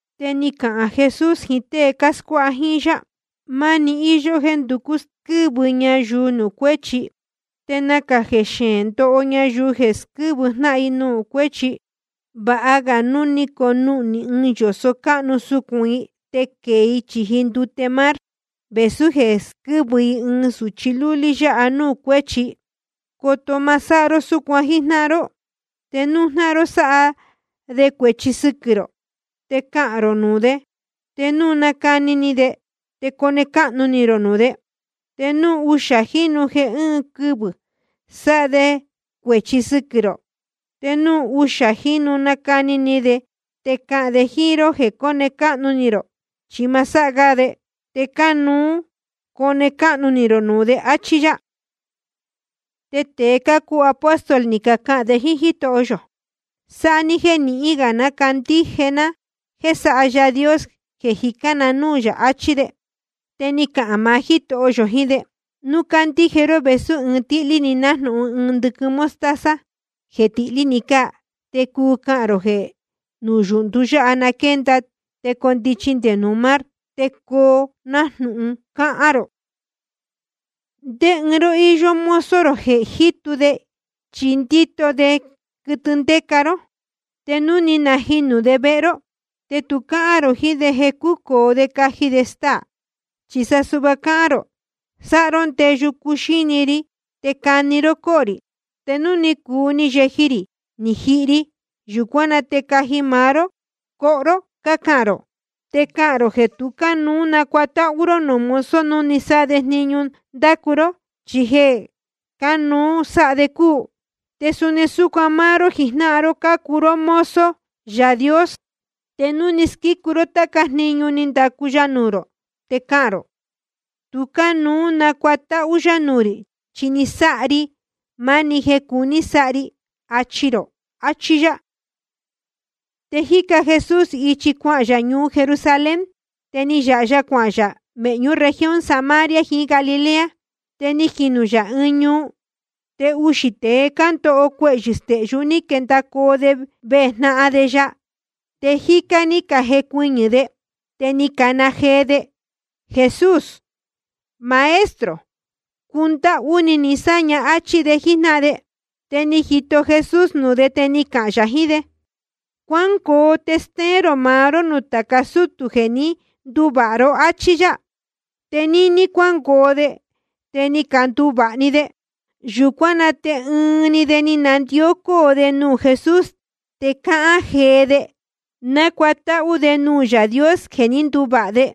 Te ni cahān Jesús jiín tée cáscuáha jíín yá: Máni íyó jéē nducú squɨ́vɨ ñayuu nuū cuéchi. Te nacā xeēn ndoho ñayuu jeē squɨ́vɨ jnáhan nuū cuéchi. Vāha ga núu ni conuhnī ɨɨn yōso cáhnu sucūn i te quēe i chīji ndute mar, vēsú jeē squɨ́vɨ i ɨɨn sūchi lúlí yáha núū cuéchi. Coto ma sáha ró súcuan jíjnáhan ró. ’Te núu jnáhan ró sáha de cuēchi sɨquɨ̄ rō, te cahān rō nuū de. Te núu nacani ni de, te cone cáhnu ni rō nuū de. Te núu uxā jínu jeē ɨ́ɨn quɨvɨ̄ sáha de cuēchi sɨquɨ̄ rō, te núu uxā jínu nácani ni de te cahān de jíín ró jeē cone cáhnu ni rō chi ma sáha ga de, te cánuú cone cáhnu ni rō nuū de. Achí yá. Te tēe cácuu apóstol ni cacahān de jíín Jítoho yō: Sáha ní jéē nīhin ga candíje ná jéē sáha Yaā Dios jeē cájicān na núū yā, achí de. Te ni cahān maá Jítoho yō jiín de: Núu cácandíje ró vēsú ɨɨn tíhlí‑ni, nájnūhun ɨɨn ndɨquɨn mostaza jeē tihlí‑ni cáa, te cuu cahān rō jeē núyūhndu yáha na quénda te nucondichi nde nuū mar, te coo nájnūhun cahān rō. ’Ndé ɨɨn ró íyó mozo rō jeē jítu de chí ndíto de quɨtɨ ndéca ró, te núu ni najinū de vehe ró, te tu cáhán rō jiín de jeē cúcōo de caji de staā. Chi sa suhva cáhán rō: Sáha ró ndeyu cuxíni ri, te cani ró cóhō rī. Te núu ni cuu ni yeji rī ni jihi ri, yūcuán na te caji maá ró coho ró, cácahān rō. Te cácahān rō jeē tu cánuú nacuatáhú ró nuū mozo núu ni sáha de jniñu ní ndacu ró, chi jeē cánuú sáha de cúu. Te suni súcuan máá ró jijnáhan ró, cácuu ró mozo Yaā Dios. Te núu ni casquícu ró táca jniñu ní ndacu ya nuū rō, te cahān rō: Tu cánuú nacuatáhú yá nuū rī, chi ni sáha ri máá‑ni jeē cánuú sáha ri, achi rō. Achí yá. Te jíca Jesús ichi cuahān yā ñuu Jerusalén, te ni yāha ya cuahān yā mēhñú región Samaria jiín Galilea. Te ni jinū yā ɨɨn ñuu, te uxī tēe ndóho cuehyɨ̄ stehyú ni quendacoo de vejnahan de ya, te jícá ní cajecuɨñɨ̄ de. Te ni cacana jee de: Jesús, Maestro, cundáhú ni ni sáña, áchí de jíjnáhan de. Te ni jito Jesús nuū de, te ni cahān yā jiín de: Cuángoo te stéén rō maá ró nuū tāca sútū jeē ní canduvāha ró, áchí yá. Te níní cuángoo de te ni canduvāha‑ni de. Yūcuán na te ɨɨn‑ni de ni nandió cóo de nuū Jesús, te cáhán jee de, nácuatáhú de nuū Yaā Dios jeē ní nduvāha de.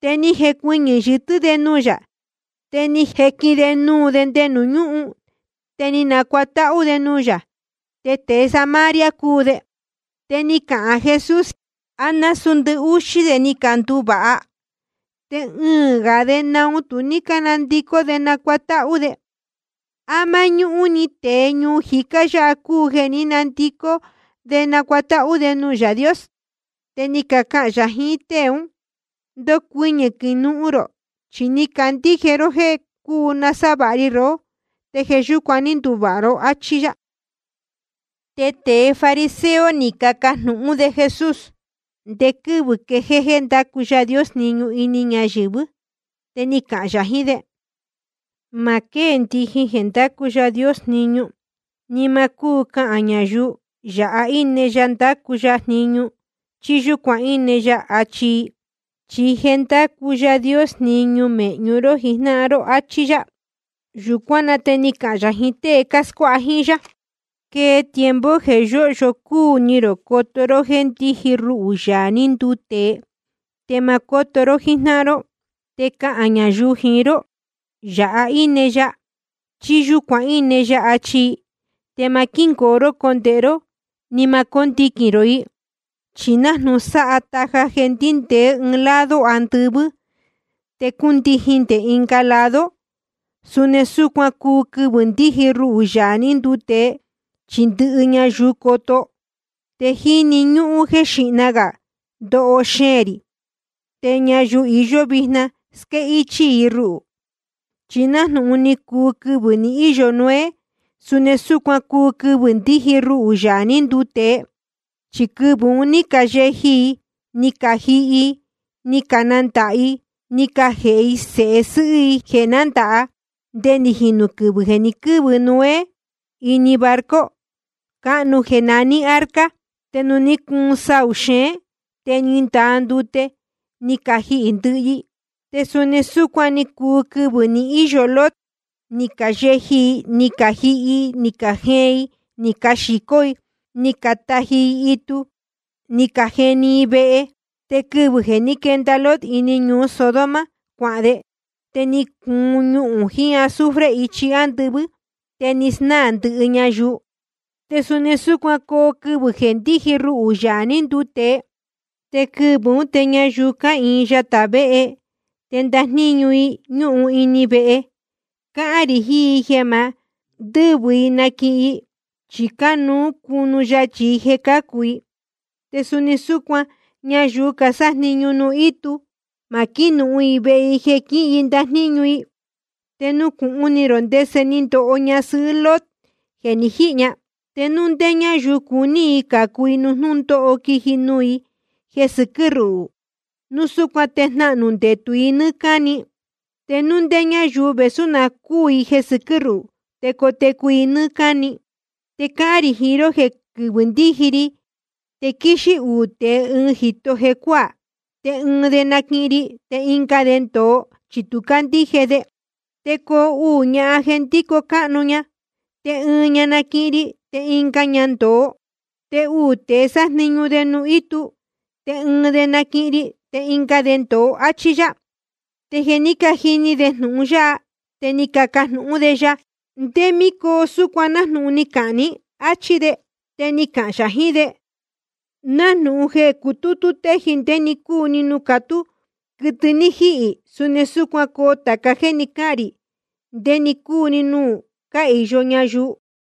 Te ni jecuɨñɨ̄ yɨtɨ́ de nuū yā, te ni jequin de nuū de nde nuū ñúhun, te ni nacuatáhú de nuū yā. Te tēe Samaria cúu de. Te ni cahān Jesús: ¿A násūú ndɨhúxí de ni canduvāha? Te ɨɨ̄n gā de, ¿naun tu ní cánandicó de nacuatáhú de? ¿A máñúhún‑ni tēe ñuu jicá yáha cúu jeē ní nandicó de nácuatáhú de nuū Yaā Dios? Te ni cahān yā jiín tée ún: Ndocuɨñɨ̄ quinuhun rō. Chi ni candíje ró jéē cuu nasávāha ri rohó, te jeē yúcuan ní nduvāha ró, áchí yá. Te tēe fariseo ni cacajnūhún de Jesús ndé quɨ́vɨ̄ quejéé jéē ndácu Yaā Dios jniñu ini ñayɨ̄vɨ́. Te ni cahān yā jiín de: Ma quéē ndijin jeē ndácu Yaā Dios jniñu. Ni ma cúu cahān ñayuu: Yāha íne ya ndácu ya jniñu, chí: Yūcuan íne ya, achi i. Chi je ndácu Yaā Dios jniñu mēhñu ró jijnáhan ró. Achí yá. Yūcuán na te ni cahān yā jiín tée cáscuáha jíín yá: Quee tiempo jeē yóhyo cúu ni rō coto ró jéē ndiji ruhū, Yaā ní nduu tēe, te ma cóto ró jíjnáhan ró. Te cahān ñayuu jiín ró: Yāha íne ya, chí: Yūcuan íne ya, achi i. Te ma quíngoo ró condēhe ró, ni ma cóndiquīn rō i. Chi nájnūhun sáha taja jeē ndíndēé ɨɨn lado andɨvɨ́ te cúndijin nde ɨnga lado, suni súcuan cuu quɨvɨ̄ ndíji ruhū, Yaā ní nduu tēe, chi ndɨhɨ ñayuu coto. Te jíni ñúhún jéē xíhna gā ndoho xeēn rī, te ñayuu iyó vijna, squéhichī i ruhū. Chi nájnūhun ni cuu quɨvɨ̄ ni íyo Noé, suni súcuan cuu quɨvɨ̄ ndíji ruhū, Yaā ní nduu tēe. Chi quɨvɨ̄ un ní cayeji i, ni cajihi i, ni canandāha i, ni cajēhe i sēhe sɨ́hɨ́ i jeē nándāha, nde ni jinū quɨvɨ̄ jeē ni quɨ́vɨ Noé ini barco cáhnu jeē naní arca. Te ni cuun saū xeén, te ni ndaa ndute ni cajihī ndɨhɨ i. Te suni súcuan ni cuu quɨvɨ̄ ni íyo Lot. Ni cayeji i, ni cajihi i, ni cajeen i, ni caxīcó i, ni cataji i itu, ni cajeni i vehe. Te quɨvɨ̄ jeē ní quenda Lot ini ñuu Sodoma cuahān de, te ni cuun ñuhūn jiín azufre ichi ándɨvɨ́, te ni snáā ndɨhɨ ñayuu. Te suni súcuan coo quɨvɨ̄ jeē ndíji ruhū, Yaā ní nduu tēe. ’Te quɨvɨ̄ ún te ñayuu cáhīin yatā véhe, te ndajníñu i ñúhun ini vehe, cáhán rī jiín i jeē ma ndɨ́vɨ i naquihin i, chi cánuú cunu yachī i jeē cácu i. Te suni súcuan ñayuu casájniñu nuū ítu, ma quínuhun i vehe i jeē quíhin i ndajníñu i. Te nucūhun ni rō ndese ni ndoho ñasɨhɨ́ Lot jeē ni jíhī ña. Te núu ndé ñáyuu cuní i cācu i nuū jnúndóho quiji nuū i jeē sɨquɨ́ ruhū, núu súcuan te jnahnū ndetū i nɨ́ɨ́ cáni. Te núu ndé ñáyuu, vēsú na cúū i jeē sɨquɨ́ ruhū, te cotecu i nɨ́ɨ́ cáni. ’Te cáhán rī jiín ró jeē quɨvɨ̄ ndíji ri te quíxí uū tēe ɨɨn jīto jecuáā, te ɨɨn de naquihin ri, te ɨnga de ndōo, chi tu ní cándíje de. Te coo uū ñahan jeē ndíco cáhnu, te ɨɨn ña naquihin ri, te ɨnga ña ndōo. Te uū tēe sájniñu de nuū ítu, te ɨɨn de naquihin ri, te ɨnga de ndōo. Achí yá. Te jeē ní cajini de jnūhun yáha, te ni cacajnūhún de ya: ¿Ndé mí coo súcuan nájnūhun ni cahān ní? Achí de. Te ni cahān yā jiín de: Nájnūhun jeē cutútú téji ndé‑ni cúu nuū catú quɨtɨ ní jíhī, suni súcuan coo tāca jéē ni cáhān rī ndé‑ni cúu‑ni nuū cáhīyo ñayuu.